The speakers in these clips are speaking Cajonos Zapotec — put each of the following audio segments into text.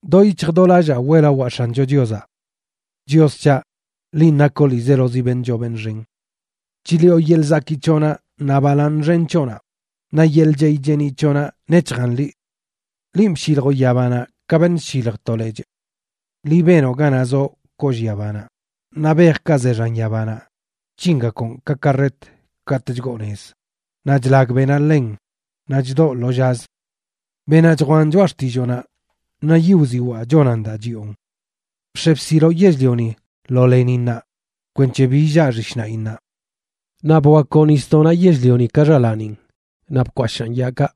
¡Do yic̱hj do lallaa weꞌlawaa X̱ancho Chiozaꞌ! ¡Chios c̱haꞌ, linꞌ nakoꞌ ḻiizelozi beṉꞌ choo beṉꞌ xen! Chliꞌo yeḻꞌ zakii c̱hoꞌnaꞌ naꞌ balaaṉ xen c̱hoꞌnaꞌ; naꞌ yeḻꞌ chey cheeniꞌ c̱hoꞌnaꞌ nec̱hjan liꞌ. Linꞌ bshiljoꞌ yabanaꞌ ka beṉꞌ chshilj to lechꞌ. Liꞌ benoꞌ ganaꞌ zoꞌ kollꞌ yabanaꞌ, naꞌ bejkaꞌ ze xan yabanaꞌ chc̱hingakoꞌn ka karret katꞌ chgoo nez; naꞌ chlag beꞌnaꞌ ḻen naꞌ chdoꞌ lo llazə. Beꞌnaꞌ chjwaꞌn choꞌa xtilloonaꞌ, naꞌ yiꞌ wziwaa chonan daa chiꞌon. Bx̱e bsiloꞌ yell-lioni lo leninnaꞌ kwenc̱he bi illaa xishnaꞌinnaꞌ. Naꞌ bwakwoꞌ nisdoꞌnaꞌ yell-lioni ka xalaanin, naꞌ bkwashaꞌn yaakaꞌ.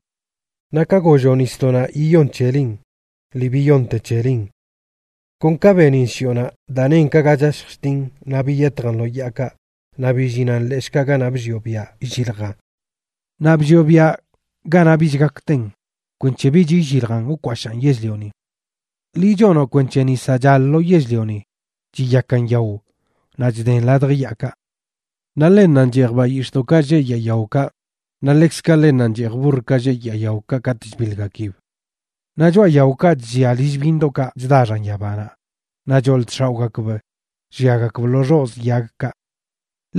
Naꞌ ka golloꞌ nisdoꞌnaꞌ yiyon c̱helin, lii biyonte c̱helin. Kon ka benin shiꞌonaꞌ, daa nen ka ga chashj chtin, naꞌ biyetjan lo yaakaꞌ naꞌ billinan leshꞌkaꞌ ganaꞌ bllioꞌ biaꞌ illiljan. Naꞌ bllioꞌ biaꞌ ganaꞌ bich gak ten, kwenc̱he bich illiljan wkwashaan yell-lioni. Liꞌ chonoꞌ kwenc̱he nisaꞌ chal lo yell-lioni chiyakan yao naꞌ chden ladj yaakaꞌ. Naꞌ ḻennanꞌ cheej bayix̱ꞌdoꞌkaꞌ lleꞌ yaa yaokaꞌ; naꞌ ḻekzkaꞌ ḻennanꞌ cheej burrkaꞌ lleꞌ yaa yaokaꞌ katꞌ chbiḻgakib. Naꞌ choꞌa yaokaꞌ chllia lill byiṉdoꞌkaꞌ chda xan yabanaꞌ; naꞌ choḻ chx̱aoꞌgakb lliagakb lo xozꞌ yagkaꞌ.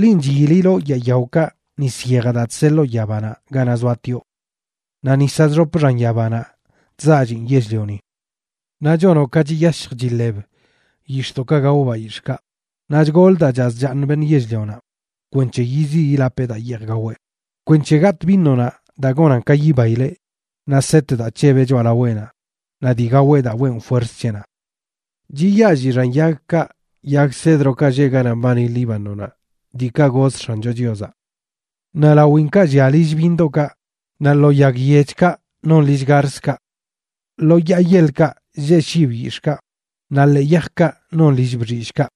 Linꞌ chyililoꞌ yaa yaokaꞌ nis yejaꞌ daa chseḻoo yabanaꞌ ganaꞌ zoatioꞌ. Naꞌ nisaꞌ chxop xan yabanaꞌ chzaallin yell-lioni. Naꞌ chonoꞌ ka chiyashj chiḻeb yix̱ꞌdoꞌkaꞌ gao bayix̱ꞌkaꞌ, naꞌ chgolə daa chaz chaaṉ beṉꞌ yell-lionaꞌ, kwenc̱he yiziꞌ yilapeꞌ daa yeej gaweꞌ, kwenc̱he gatꞌ vinonaꞌ daa gonan ka yibaileꞌ, naꞌ set daa c̱hebeꞌ choꞌalaweꞌnaꞌ, naꞌ dii gaweꞌ daa weꞌn fuerz c̱heꞌnaꞌ. Chiyaalli xan yagkaꞌ, yag cedrokaꞌ lleꞌ ganaꞌ mbani Líbanonaꞌ, diikaꞌ goz X̱ancho Chiozaꞌ. Naꞌ lawinkaꞌ llia lill byiṉdoꞌkaꞌ, naꞌ lo yag yechkaꞌ non lill garzkaꞌ. Lo yaa yeḻkaꞌ lleꞌ shib yix̱ꞌkaꞌ, naꞌ ḻee yajkaꞌ non lill bxillꞌkaꞌ.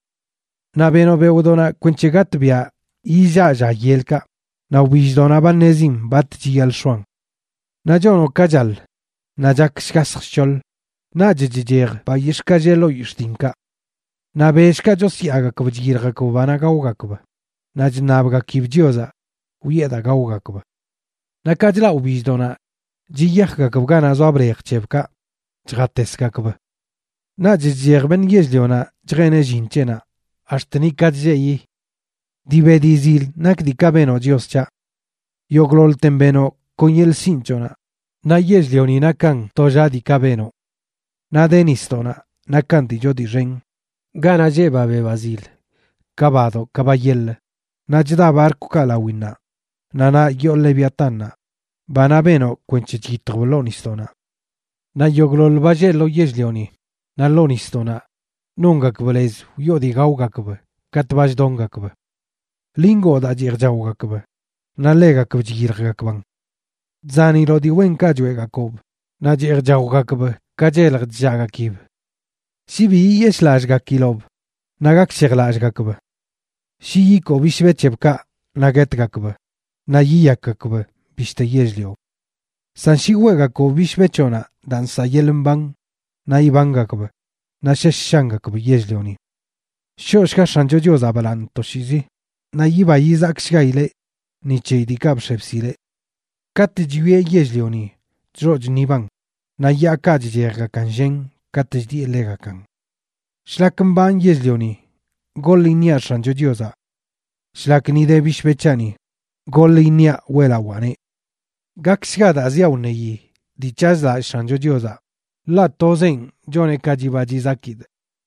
Naꞌ benoꞌ beoꞌdoꞌnaꞌ kwenc̱he gatꞌbiaꞌ yillaꞌ lla yelkaꞌ; naꞌ wbilldoꞌnaꞌ ba ṉezin bat chiyaḻꞌ x̱oan. Naꞌ chonoꞌ ka chaḻ, naꞌ chak shgasj shc̱hoḻ, naꞌch chchej bayix̱ꞌkaꞌ lleꞌ ḻoo yix̱ꞌ dinkaꞌ. Naꞌ bellkaꞌ chosyaagakb chyiljgakb banaꞌ gaogakb; naꞌ chṉabgakib Chiozaꞌ wiꞌe daa gaogakb. Naꞌ ka chlaꞌ wbilldoꞌnaꞌ chiyajgakb ganaꞌ zoa blej c̱hebkaꞌ chjatesgakb. Naꞌch chchej beṉꞌ yell-lionaꞌ chjeneꞌ llin c̱heꞌnaꞌ, ax̱t nika chlleꞌyi. ¡Dii be dii zil nak diikaꞌ benoꞌ, Chios c̱haꞌ! Yogꞌḻoḻten benoꞌ kon yeḻꞌ sinꞌ c̱hoꞌnaꞌ, naꞌ yell-lioni nakan tollaꞌ diikaꞌ benoꞌ. Naꞌ de nisdoꞌnaꞌ, nakan dii choo dii xen, ganaꞌ lleꞌ ba be ba zil, ka badoꞌ ka ba yeḻə. Naꞌ chda barkwkaꞌ lawinnaꞌ; naꞌ naꞌ yoo Leviatánnaꞌ, banaꞌ benoꞌ kwenc̱he chyitjb ḻoo nisdoꞌnaꞌ. Naꞌ yogꞌḻoḻ ba lleꞌ lo yell-lioni naꞌ ḻoo nisdoꞌnaꞌ nongakb lez wiꞌo dii gaogakb katꞌ ba chdongakb. Liꞌ ngoo daa cheej chaogakb, naꞌ ḻegakb chyiljgakbaꞌn. Chzaniloꞌ dii wenkaꞌ choeꞌgakoob, naꞌ cheej chaogakb ka chelj chllaꞌgakib. Shi bi yiyeshꞌlallꞌgakiloꞌb, naꞌ gakshejlallꞌgakb. Shi yikoo bishbe c̱hebkaꞌ, naꞌ guetgakb naꞌ yiyakgakb bishte yell-lio. San shi weꞌgakoꞌb bishbe c̱hoꞌnaꞌ daa nsaꞌ yeḻꞌ mban, naꞌ ibangakb, naꞌ shesh shangakb yell-lioni. ¡Shoꞌshga X̱ancho Chiozaꞌ balaaṉ toshiizi! Naꞌ yiba yizakshgaileꞌ ni c̱heyi diikaꞌ bx̱e bsileꞌ. Katꞌ chwieꞌ yell-lioni, chxoꞌ chṉiban; naꞌ yaakaꞌ chchejgakan llen katꞌ chdiꞌe ḻegakan. Shlak mbanꞌ yell-lioni, goḻ iṉiaꞌ X̱ancho Chiozaꞌ. Shlak ni de bishbe c̱haꞌni, goḻ iṉiaꞌ weꞌlawaaneꞌ. Gakshga daa ziaꞌ wṉeyi dii c̱hazlallꞌ X̱ancho Chiozaꞌ, ḻaꞌ tozenꞌ choneꞌ ka chiba chizakidꞌ.